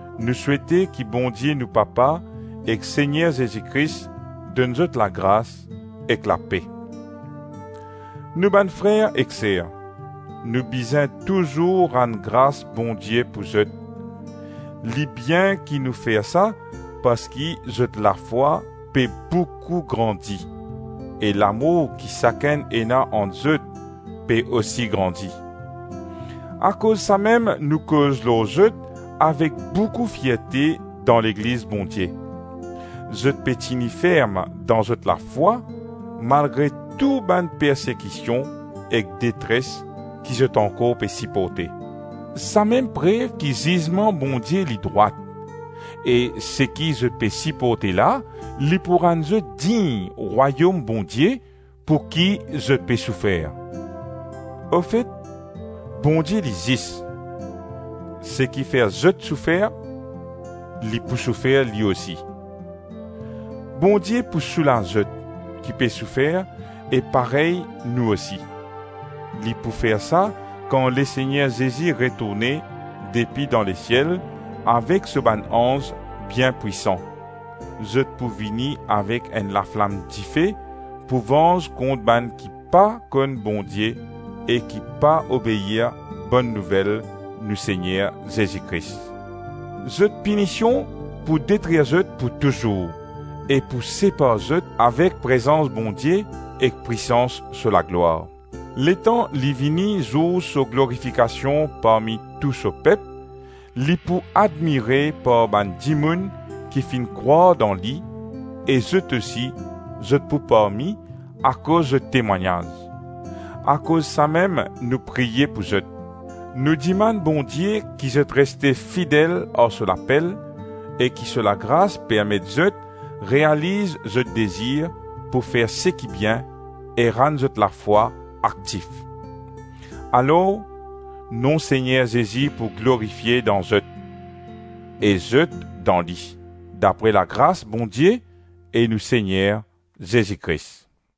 Nou souete ki Bondie nou Papa ek Segner Zezi Kris donn zot lagras ek lape. Nou bann frer ek ser, nou bizin touzour rann gras Bondie pou zot. Li bien ki nou fer sa, parski zot lafwa pe boukou grandi, e lamour ki sakenn ena ant zot pe osi grandi. Akoz samem nou koz lor zot avek boukou fierte dan legliz Bondie. Zot pe tini ferm dan zot lafwa malgre tou bann persekision ek detres ki zot ankor pe siporte. Samem prev ki zizman Bondie li drwat, e seki zot pe siporte la, li pou rann zot dign Rwayom Bondie, pou ki zot pe soufer. Ofet, Bondie li zis; seki fer zot soufer, li pou soufer li osi. Bondie pou soulaz zot, ki pe soufer, e parey nou osi. Li pou fer sa kan Lesegner Zezi retourne depi dan lesiel avek so bann anz bien pwisan, zot pou vini avek enn laflam dife, pou vanz kont bann ki pa konn Bondie e ki pa obeir Bonn Nouvel nou Segner Zezi Kris. Zot pinision pou detrir zot pou touzour e pou separ zot avek prezans Bondie ek pwisans so laglwar. Letan li vini zour so glorifikasion parmi tou so pep, li pou admire par bann dimoun ki finn krwar dan li e zot osi zot pou parmi akoz zot temwagnaz. Akoz samem nou priye pou zot, nou dimann Bondie ki zot reste fidel ar so lapel e ki so lagras permet zot realiz zot dezir pou fer seki bien e rann zot lafwa aktif. Alor, nom Segner Zezi pou glorifie dan zot, e zot dan li, dapre lagras Bondie e nou Segner Zezi Kris.